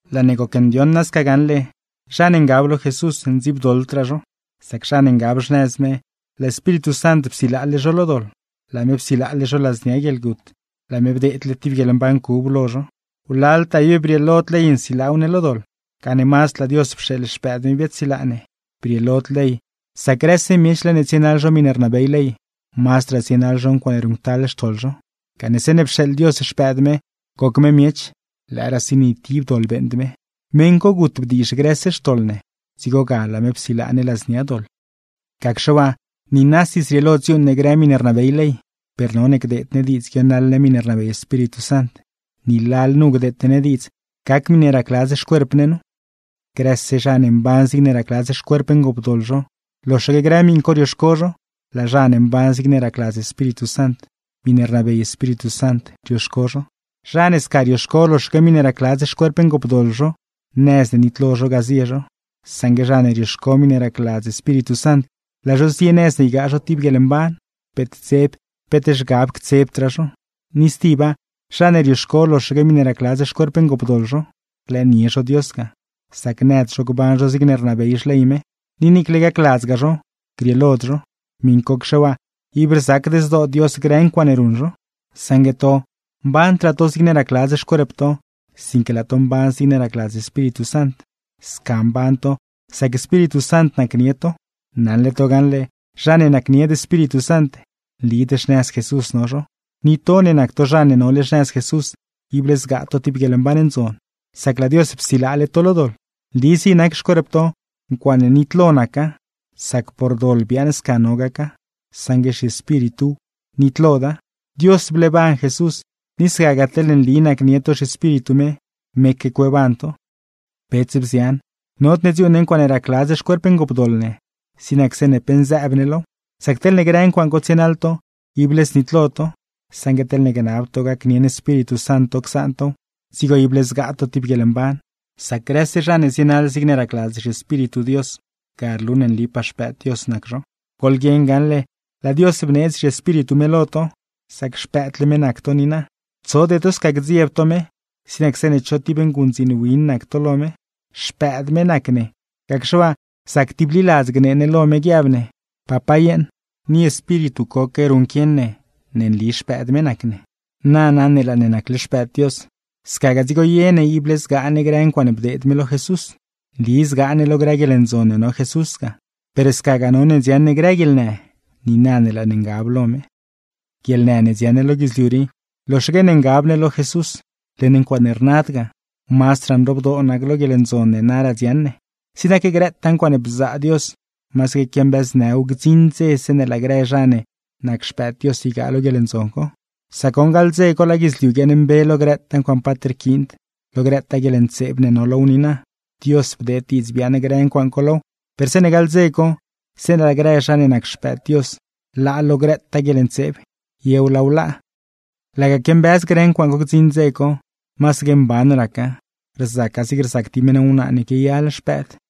Laa ne gocndioṉ nasca gaṉle, zha ne ngab lo Jesús ndziibdoḻdraa zho, sac zha ne ngab xnëz me, laa Espíritu Sant psilaale zho lo doḻ, laa me psilaale zho ladznia guieḻgut, laa me bdeedle tib guieḻmban cub lo zho. Wlaltaa ib brieelod ley nsilaaw ne lo doḻ, gane mazd laa Dios pxeeḻ Xpëëd me biaadsilaa ne. Brieelod ley, sac grëse miech laa ne tsienaḻ zho miṉe rnabey ley, mazdraa zienaḻ zho ncuaaṉe ruṉctal xtoḻ zho. Gane zeeṉe pxeeḻ Dios Xpëëd me, goc me miech (lëëraasi ni tib doḻ beeṉd me), meṉ co gut bdiizh grëse xtoḻ ne, dzigo ga laa me psilaa ne ladznia doḻ. Gacxe waa, niinasi zrieelo dziuuṉ ne grë miṉe rnabey ley, per none gdeed ne diidz guionaḻ ne miṉe rnabey Espíritu Sant, ni lalnu gdeete ne diidz gac miṉe racladz xcuerp ne nu. Grëse zha ne mban zigne racladz xcuerp ngoopdoḻ zho, loxaque grë miṉ co rioxco zho; laa zha ne mban zigne racladz Espíritu Sant, miṉe rnabey Espíritu Sant rioxco zho. Zha ne sca rioxco loxaque miṉe racladz xcuerp ngoopdoḻ zho, nëz ne nitlo zho ga zie zho; saṉgue zha ne rioxco miṉe racladz Espíritu Sant, laa zho zie nëz ne ygaa zho tib guieḻmban; peet dzeb, peet zhgab ctsebdraa zho. Ni stiba, zha ne rioxco loxaque miṉe racladz xcuerp ngoopdoḻ zho, rlëënie zho Dios ga, sac nëd zho gban zho zigne rnabey xley me; ni niicle gacladzgaa zho, grieelod zho. Miṉcocxe waa, ib rzacd zdoo Dios grë ncuaaṉe ruṉ zho. Saṉgue to, mbandraa to zigne racladz xcuerp to, sinque laa to mban zigne racladz Espíritu Sant. Sca mban to, sac Espíritu Sant nacnie to. Naṉle to gaṉle zha ne nacnied Espíritu Sant, nlid xnëz Jesús no zho. Ni to ne nac to zha ne nole xnëz Jesús, ible zgaa to tib guieḻmban ndzon, sac laa Dios psilaale to lo doḻ. Nli zig nac xcuerp to, ncuaaṉe nitlo naca, sac por doḻ biaaṉ sca no gaca; saṉgue zhiespírituw, nitloda. Dios bleeban Jesús, ni scagaa teḻne nli nacnie to zhiEspíritu me, meque cueeban to. Bets, bzian, nodne dziuuṉ ne ncuaaṉe racladz xcuerp ngoopdoḻ ne, zig nac zeeṉe pe nzëëb ne low. Sac teḻne grë ncuaaṉ co tsienaḻ to, ible znitlo to; saṉgue teḻne gnab to gacnieṉ Espíritu Sant to csaan tow, dzigo ible zgaa to tib guieḻmban. Sac grëse zha ne zienaḻ zigne racladz zhiEspíritu Dios, ga rlu ne nlipaa xpëëd Dios nac zho. Goḻguieṉ gaṉle, laa Dios bneedz zhiEspíritu me lo to, sac xpëëdle me nac to niina. Tsode to sca gdziebd to me, zig nac zeeṉe cho tib nguṉdziin win nac to lo me. Xpëëd me nac ne, gacxe waa zac tibliladz gnee ne lo me guiab ne: “¡Papá yeeṉ!” Ni Espíritu coque ruṉquieṉ ne ne nli xpëëd me nac ne. Nana ne laa ne nacle xpëëd Dios, scagaa dzigo ye ne ible zgaa ne grëtaa ncuaaṉe bdeed me lo Jesús. Nli zgaa ne lo grë guieḻndzon ne no Jesús ga, per scagaa none dziaṉ ne grë guieḻnë niina ne laa ne ngab lo me. Guieḻnë ne dziaṉ ne lo guidzliu rii, loxaque ne ngab ne lo Jesús, led ncuaaṉe rnad ga; mazdraa nroobdoo nac lo guieḻndzon ne naraa dziaṉ ne. Zig nac grëtaa ncuaaṉe bzaa Dios, masaque quiambëznëw gdziṉ dze zeeṉe laa grë zha ne nac xpëëd Dios ygaa lo guieḻndzon co; sac goṉ, gaḻ dze co laa guidzliu guiaaṉmbe lo grëtaa ncuaaṉ paat rquiind, lo grëtaa guieḻntseeb ne no low niina. Dios bdeed diidz biaaṉ grë ncuaaṉ co low, per zeeṉe gaḻ dze co, zeeṉe laa grë zha ne nac xpëëd Dios laa lo grëtaa guieḻntseeb, yew laaw laa. Laga quiambëz grë ncuaaṉ co gdziṉ dze co, masaque mban raca, rzaca zig rzac tib meṉ wnaa ne quiayal xpëëd.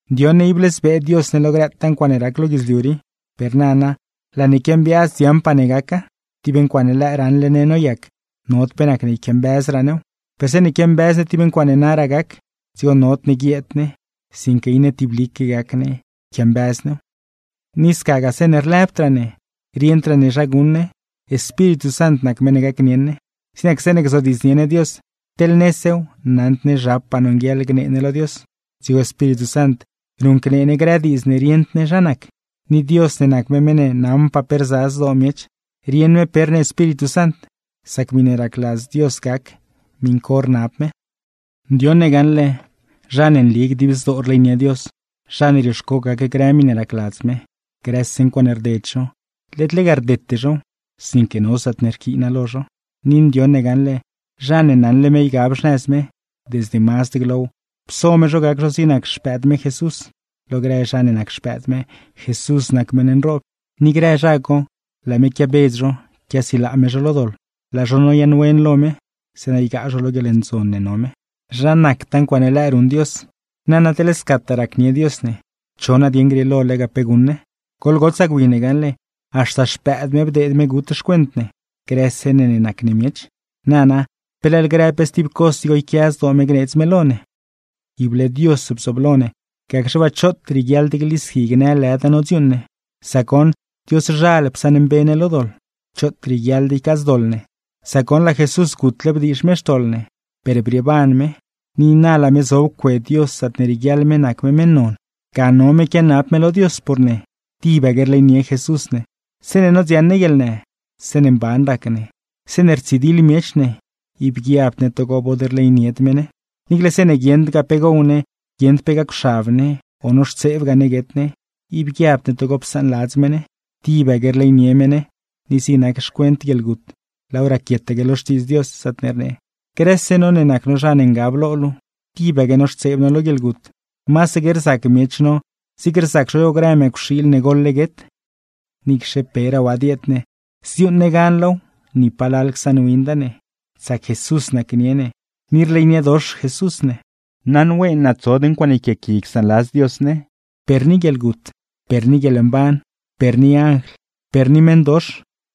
Ndioṉ ne ible zbee Dios ne lo grëtaa ncuaaṉe rac lo guidzliu rii, per nana laa ne quiambiaaz dziaṉpaa ne gaca. Tib ncuaaṉe lëë raṉle ne noyac, nod pe nacne yquiambëzraa new, per zeeṉe quiambëz ne tib ncuaaṉe naraa gac, dzigo nodne guieed ne, sinque iṉe tiblique gac ne yquiambëz new. Ni scagaa zeeṉe lëbdraa ne, rieṉdraa ne zha guṉ ne, Espíritu Sant nac meṉ ne gacnieṉ ne. Zig nac zeeṉe gzodiidznie ne Dios, teḻ nesew naṉd ne zhapaa nonguieḻ gnee ne lo Dios, dzigo Espíritu Sant ruṉcnee ne grë diidz ne rieṉd ne zha nac. Ni Dios ne nac me meṉ ne naṉpaa pe rza zdoo miech, rieṉ me pe rnee Espíritu Sant, sac miṉe racladz Dios gac miṉ co rnab me. Ndioṉ ne gaṉle, zha ne nli dib zdoo rleynie Dios, zha ne rioxco gac grë miṉe racladz me, grëse ncuaaṉe rded zho, led lega rdete zhow, sinque no zaatne rquiina lo zho. Ni ndioṉ ne gaṉle, zha ne naṉle me ygab xnëz me, desde mazd glow, pso me zho gac zho zig nac Xpëëd me Jesús. Lo grë zha ne nac xpëëd me, Jesús nac meṉ nroob. Ni grë zha co, laa me quiabedz zho, quiasilaa me zho lo doḻ, laa zho noyaaṉwen lo me; zeeṉa ygaa zho lo guieḻndzon ne no me. ¡Zha nactaa ncuaaṉe lëë ruṉ Dios! Nana, teḻ scataa racnie Dios ne, ¿cho nadieṉ grieelo lega pe guṉ ne? Goḻgotsaa gwi ne gaṉle, haxta xpëëd me bdeed me gut xcuent ne, grëse ne ne nac ne miech. Nana, ¿pe leḻ grë pe stib cos dzigo yquia zdoo me gneedz me lo ne? Ible Dios bzooblo ne, gacxe waa, ¡choot rieguiaḻd glisqui gnë lëda nodziuuṉ ne! Sac goṉ, Dioszhal psaṉmbe ne lo doḻ. ¡Choot rieguiaḻd ycaadzdoḻ ne! Sac goṉ laa Jesús gutle bdiizh me xtoḻ ne; per brieeban me, ni na laa me zob cue Dios zaatne rieguiaḻ me nac me meṉ non. Ga no me quianab me lo Dios por ne. ¡Tibaque rleynie Jesús ne! Zeeṉe nodziaṉ ne guieḻnë, zeeṉe mban rac ne, zeeṉe rtsidiḻ miech ne, ib guiabd ne togo bod rleynied me ne. Niicle zeeṉe guieṉdgaa pe gow ne, guieṉd pe gacwxab ne, o noxtseebgaa ne guet ne, ib guiabd ne togo psaanladz me ne. ¡Tibaque rleynie me ne! Ni zig nac xcuent guieḻgut, laaw raquietaque lo Xtiidz Dios, zaatne rnee: Grëse no ne nac no zha ne ngab lo luu, tibaque noxtseeb no lo guieḻgut; masaque rzac miech no zig rzac zho grë mëcwxiil ne goḻle guet. Niicxe peraa waa dieed ne, zdziuuṉ ne gan low ni palal csaṉwinda ne, sac Jesús nacnie ne; ni rleyniedox Jesús ne. Naṉween naa tsod ncuaaṉe yquiaaqui csaanladz Dios ne: per ni guieḻgut, per ni guieḻmban, per ni anjl, per ni meṉdox,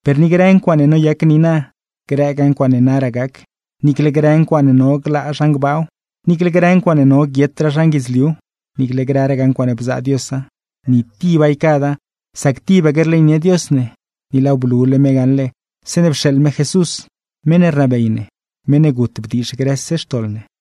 per ni grë ncuaaṉe noyac niina, grëgaa ncuaaṉe naraa gaca. Niicle grë ncuaaṉe no glaa zhan gbaaw, niicle grë ncuaaṉe no guietraa zhan guidzliuw, niicle grëragaa ncuaaṉe bzaa Diosa. ¡Ni tiba ycada, sac tibaque rleynie Dios ne! Ni laaw blule me gaṉle, zeeṉe pxeeḻ me Jesús (meṉ ne rnabey ne), meṉ ne gut bdiizh grëse xtoḻ ne.